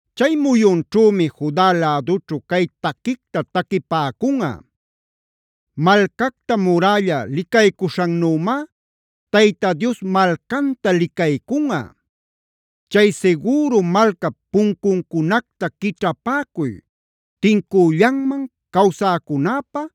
Chay muyunćhümi Juda lädućhu cay taquicta taquipäcunꞌa: “Malcacta murälla licaycuśhannümá Tayta Dios malcanta licaycunꞌa. Chay sigüru malcap puncucunacta quićhapäcuy tincüllanman cawsäcunäpä,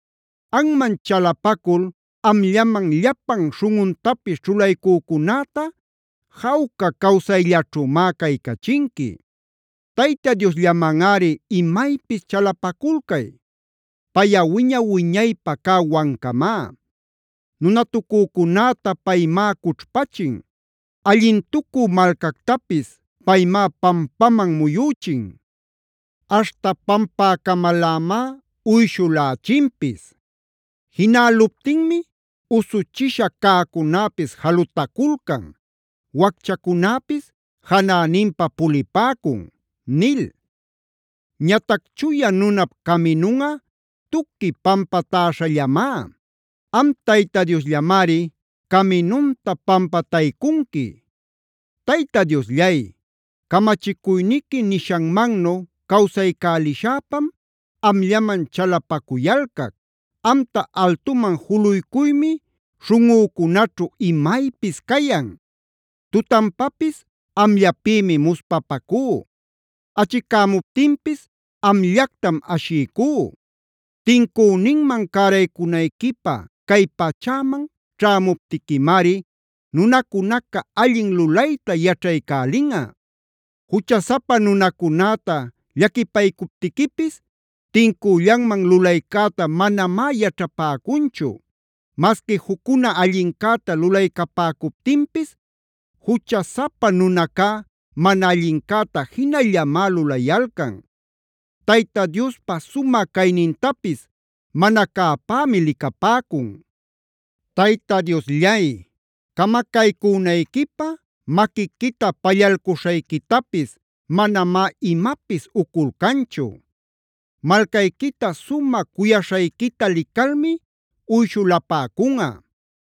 Anman chalapacul amllaman llapan śhunꞌuntapis ćhulaycücunäta, jawca cawsayllaćhümá caycachinqui. Tayta Diosllamanꞌari imaypis chalapaculcay; payꞌa wiña-wiñaypä cä Wancamá. Nunatucücunäta paymá cućhpachin; allintucü malcactapis paymá pampaman muyüchin, aśhta pampäcamalämá uyshulächinpis. Jinäluptinmi usuchisha cäcunäpis jalutaculcan; wacchacunäpis janäninpa pulipäcun” nil. Ñatac chuya nunap caminunꞌa tuqui pampatäśhallamá; am Tayta Diosllamari caminunta pampataycunqui. Tayta Diosllay, camachicuyniqui nishanmannu cawsaycälishäpam, amllaman chalapacuyalcac. Amta altuman juluycuymi śhunꞌücunaćhu imaypis cayan. Tutanpapis amllapïmi muspapacú; achicämuptinpis amllactam ashiycú. Tincüninman cäraycunayquipä cay pachäman ćhämuptiquimari, nunacunaca allin lulayta yaćhaycälinꞌa. Juchasapa nunacunäta llaquipaycuptiquipis tincüllanman lulaycäta manamá yaćhapäcunchu. Masqui juccuna allincäta lulaycapäcuptinpis juchasapa nunacá mana allincäta jinallamá lulayalcan; Tayta Diospa sumä caynintapis mana cäpämi licapäcun. Tayta Diosllay, camacaycünayquipä maquiquita pallalcuśhayquitapis manamá imapis uculcanchu. Malcayquita sumä cuyaśhayquita licalmi uyshulapäcunꞌa.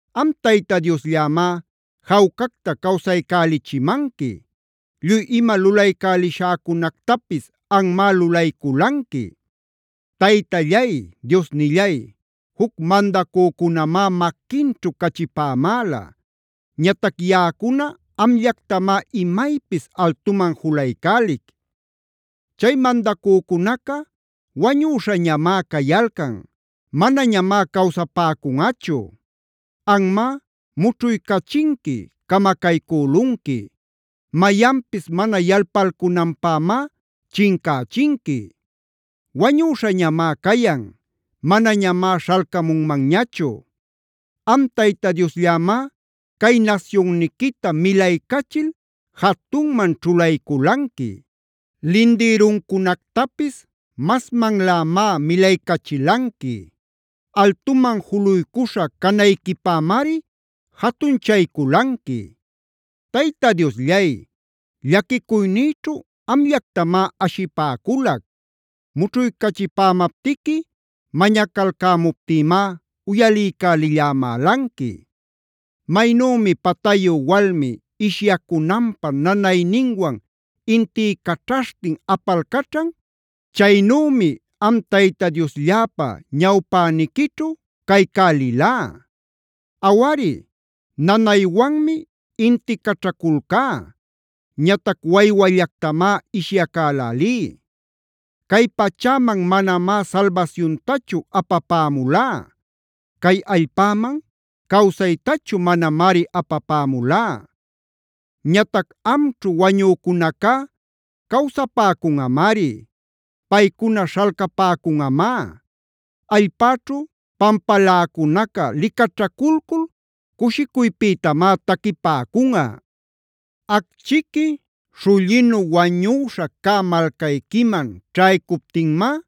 Am Tayta Diosllämá jawcacta cawsaycälichimanqui; lluy ima lulaycälishäcunactapis anmá lulayculanqui. Taytallay, Diosnillay juc mandacücunamá maquinćhu cachipämäla; ñatac yaꞌacuna amllactamá imaypis altuman julaycälic. Chay mandacücunaca wañüśhañamá cayalcan; manañamá cawsapäcunꞌachu. Anmá mućhuycächinqui, camacaycülunqui; mayanpis mana yalpalcunanpämá chincächinqui. Wañüśhañamá cayan; manañamá śhalcamunmanñachu. Am Tayta Diosllämá cay nasyunniquita milaycachil jatunman ćhulayculanqui. Lindïruncunactapis masmanlämá milaycachilanqui. Altuman juluycuśha canayquipämari jatunchayculanqui. Tayta Diosllay, llaquicuynïćhu amllactamá ashipäculac; mućhuycachipämaptiqui mañacalcämuptïmá uyaliycälillämälanqui. Maynümi patayu walmi ishyacunanpä nanayninwan intiycaćhaśhtin apalcaćhan, chaynümi am Tayta Dioslläpa ñawpäniquićhu caycälilá. Awari, nanaywanmi inticaćhaculcá; ñatac waywallactamá ishyacälälí. Cay pachäman manamá salbasyuntachu apapämulá; cay allpäman cawsaytachu manamari apapämulá. Ñatac amćhu wañücunacá cawsapäcunꞌamari; paycuna śhalcapäcunꞌamá. Allpäćhu pampaläcunaca licaćhaculcul cushicuypïtamá taquipäcunꞌa. Acchiqui śhullinu wañüśha cä malcayquiman ćhaycuptinmá,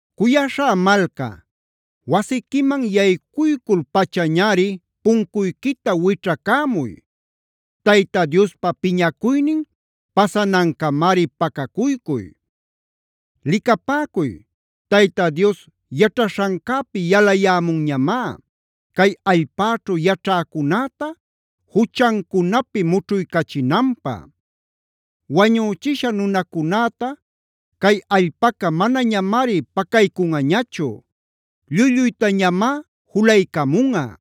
Cuyaśhá malca, wasiquiman yaycuycul-pachañari puncuyquita wićhacämuy. Tayta Diospa piñacuynin pasanancamari pacacuycuy. Licapäcuy, Tayta Dios yaćhaśhancäpi yalayämunñamá, cay allpäćhu yaćhäcunäta juchancunapi mućhuycachinanpä. Wañüchisha nunacunäta cay allpaca manañamari pacaycunꞌañachu; lluy-lluytañamá julaycamunꞌa.